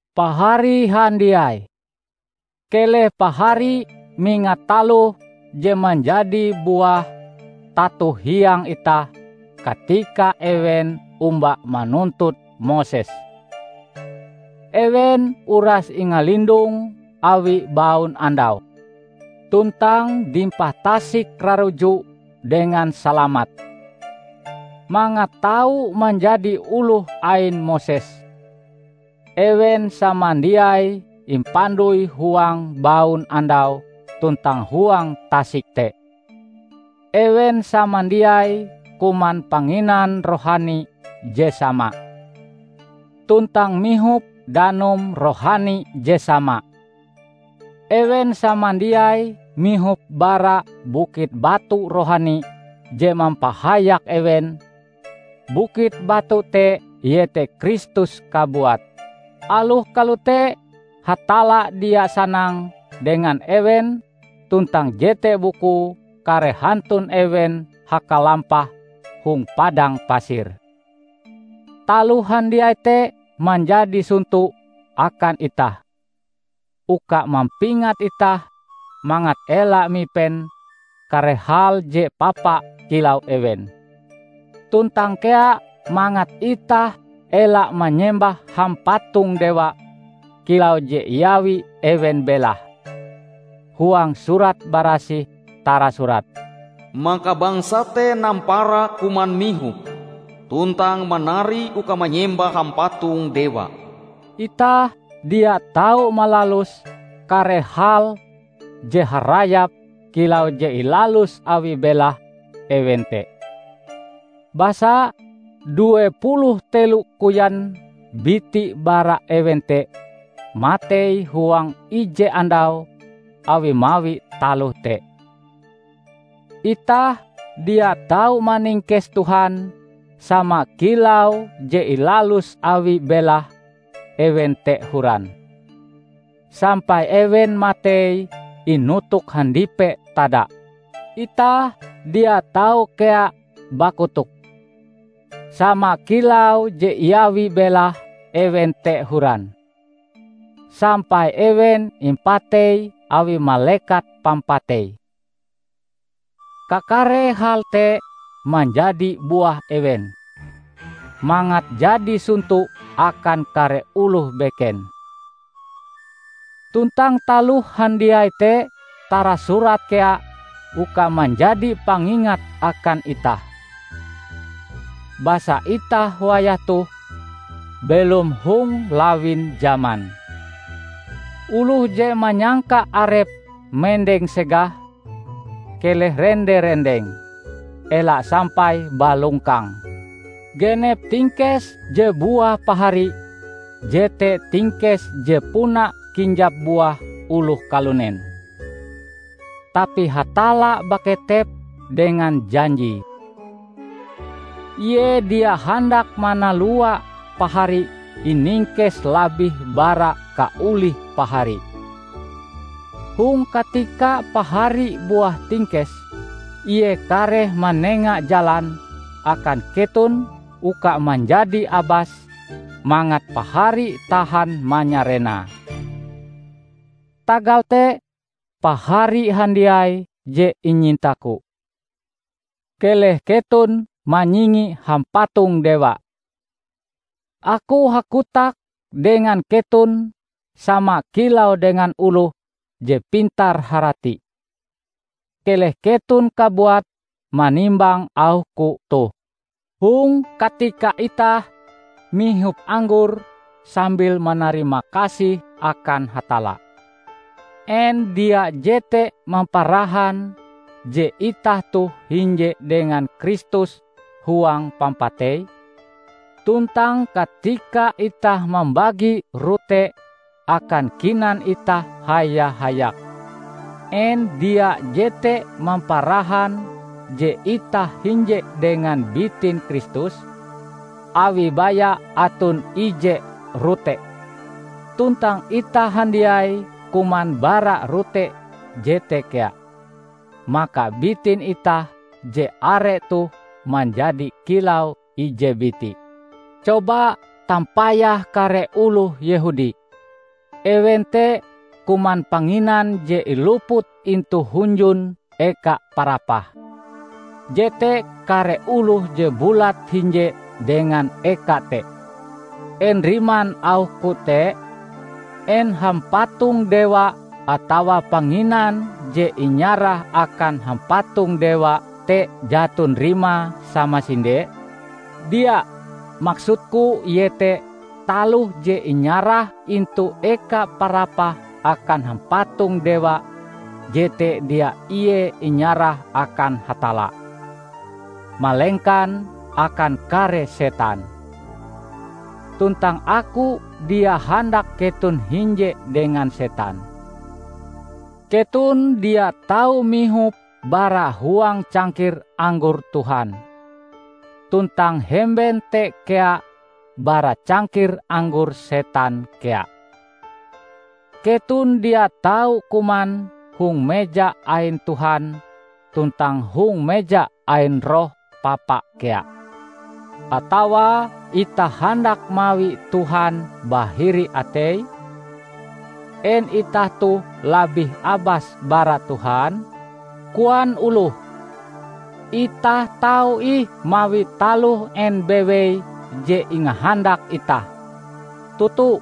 Pahari handiai! Keleh pahari mingat taloh je manjadi buah tato hiang itah katika ewen omba manuntut Moses. Ewen uras ingalindong awi baunandau, tuntang dimpah Tasik Raruju dengan salamat. Mangat tau manjadi oloh ain Moses, ewen samandiai impandoi huang baunandau tuntang huang tasik te. Ewen samandiai kuman panginan rohani je sama, tuntang mihop danum rohani je sama. Ewen samandiai mihop bara bukit batu rohani je mampahayak ewen; bukit batu te iete Kristus kabuat. Aloh kalote, Hatalla dia sanang dengan ewen tuntang jete bukue kare hantun ewen hakalampah hong padang pasir. Taloh handiai te manjadi sonto akan itah, uka mampingat itah mangat ela mipen kare hal je papa kilau ewen. Tuntang kea mangat itah ela manyembah hampatong dewa kilau je iawi ewen belahe. Huang Surat Barasih tarasurat, "Maka bangsa te nampara kuman mihop, tuntang manari uka manyembah hampatong dewa." Itah dia tau malalus kare hal je harayap kilau je ilalus awi belahe ewen te. Basa, due puluh telo koyan biti bara ewen te matei huang ije andau awi mawi taloh te. Itah dia tau maningkes Tuhan sama kilau je ilalus awi belahe ewen te horan, sampai ewen matei inotok handipe tada. Itah dia tau kea bakotok; sama kilau je iawi belahe ewen te horan, sampai ewen impatei awi Malekat Pampatei. Kakare hal te manjadi buah ewen, mangat jadi sonto akan kare oloh beken. Tuntang taloh handiai te tarasurat kea uka manjadi pangingat akan itah. Basa itah wayah toh belom hong lawin jaman. Oloh je manyangka arepe mendeng segah, keleh rende-rendeng; ela sampai balongkang. Genep tingkes je buah pahari jete tingkes je puna kinjap buah oloh kalunen. Tapi Hatalla baketep dengan janjie. Ie dia handak manalua pahari iningkes labih bara kaolih pahari. Hong katika pahari buah tingkes, ie kareh manenga jalan akan keton uka manjadi abas mangat pahari tahan manyarenae. Tagal te, pahari handiai je inyintaku, keleh keton manyingi hampatong dewa. Aku hakotak dengan keton sama kilau dengan oloh je pintar-harati. Keleh keton kabuat manimbang auhku toh. Hong katika itah mihop anggor sambil manarimakasih akan Hatalla, en dia jete mamparahan je itah toh hinje dengan Kristus huang pampateie? Tuntang katika itah mambagi rote akan kinan itah haya-hayak, en dia jete mamparahan je itah hinje dengan bitin Kristus? Awi baya aton ije rote, tuntang itah handiai kuman bara rote jete kea, maka bitin itah je are toh manjadi kilau ije biti. Coba tampayah kare oloh Yehudi. Ewen te kuman panginan je iluput intu hunjun eka parapah, jete kare oloh je bulat-hinje dengan eka te. En riman auhku te? En hampatong dewa atawa panginan je inyarah akan hampatong-dewa te jaton rimae samasinde? Dia! Maksudku iete taloh je inyarah intu eka parapah akan hampatong dewa jete dia ie inyarah akan Hatalla, malengkan akan kare setan. Tuntang aku dia handak keton hinje dengan setan. Keton dia tau mihop bara huang cangkir anggor Tuhan, tuntang hemben te kea bara cangkir anggor setan kea. Keton dia tau kuman hong meja ain Tuhan tuntang hong meja ain roh papa kea. Atawa itah handak mawi Tuhan bahiri ateie? En itah toh labih abas bara Tuhan? Koan oloh, "Itah tau ih mawi taloh en bewei je ingahandak itah." Toto!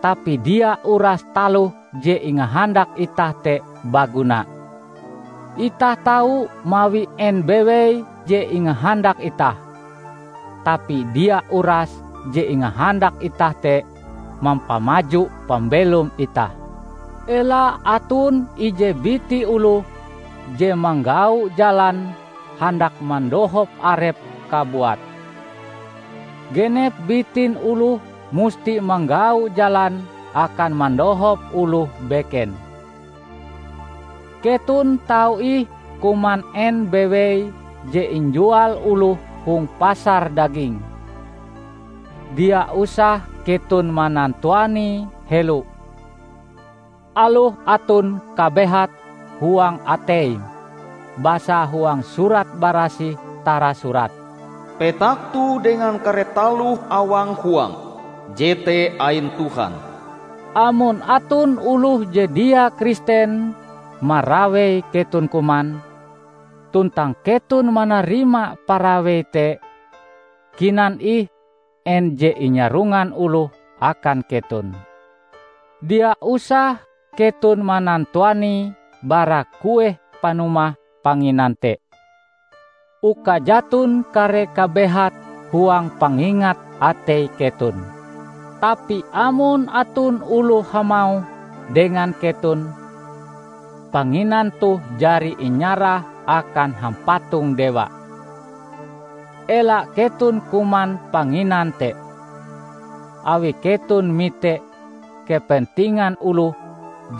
Tapi dia uras taloh je ingahandak itah te baguna. "Itah tau mawi en bewei je ingahandak itah" -- tapi dia urase je ingahandak itah te mampamaju pambelom itah. Ela aton ije biti oloh je manggau jalan handak mandohop arepe kabuat. Genep bitin oloh musti manggau jalan akan mandohop oloh beken. Keton tau ih kuman en bewei je injual oloh hong pasar daging. Dia usah keton manantuanie helo, aloh aton kabehat huang ateim. Basa huang Surat Barasih tarasurat, "Petak toh dengan kare taloh awang huange jete ain Tuhan." Amon aton oloh je dia Kristen marawei keton kuman, tuntang keton manarima parawei te, kinan ih en je inyarongan oloh akan keton. Dia usah keton manantuanie bara kueh panumahe panginan te, uka jaton kare kabehat huang pangingat atei keton. Tapi amon aton oloh hamauh dengan keton, "Panginan toh jari inyarah akan hampatong dewa," ela keton kuman panginan te, awi keton mite kepentingan oloh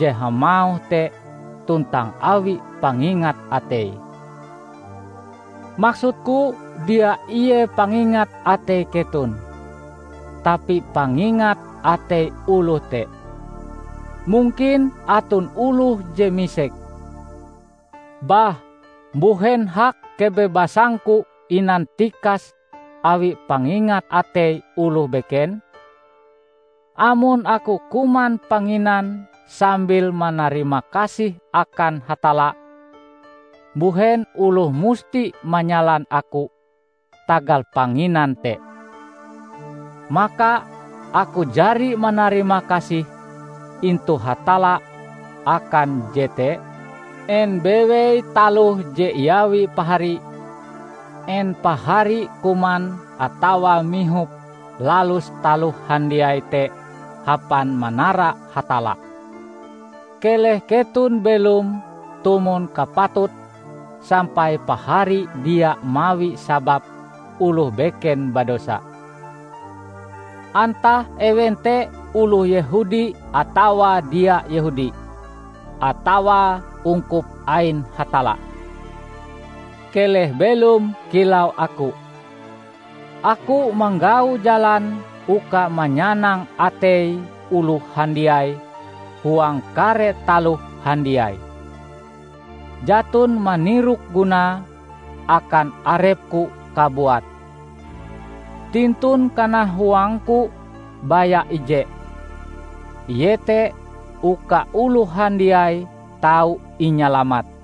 je hamauh te tuntang awi pangingat atei. Maksudku dia ie pangingat atei keton, tapi pangingat atei oloh te. Mungkin aton oloh je misek, "Bah, mbuhen hak kebebasangku inantikas awi pangingat atei oloh beken? Amon aku kuman panginan sambil manarimakasih akan Hatalla, mbuhen oloh musti manyalan aku tagal panginan te, maka aku jari manarimakasih intu Hatalla akan jete?" En bewei taloh je iawi pahari -- en pahari kuman atawa mihop lalus taloh handiai te hapan manara Hatalla. Keleh keton belom tumon kapatute sampai pahari dia mawi sabab oloh beken badosa; antah ewen te oloh Yehudi atawa dia Yehudi, atawa ungkup ain Hatalla. Keleh belom kilau aku. Aku manggau jalan uka manyanang atei oloh handiai huang kare taloh handiai, jaton manirok gunae akan arepku kabuat. Tintun kanahuangku baya ije, iete uka oloh handiai tau inyalamat.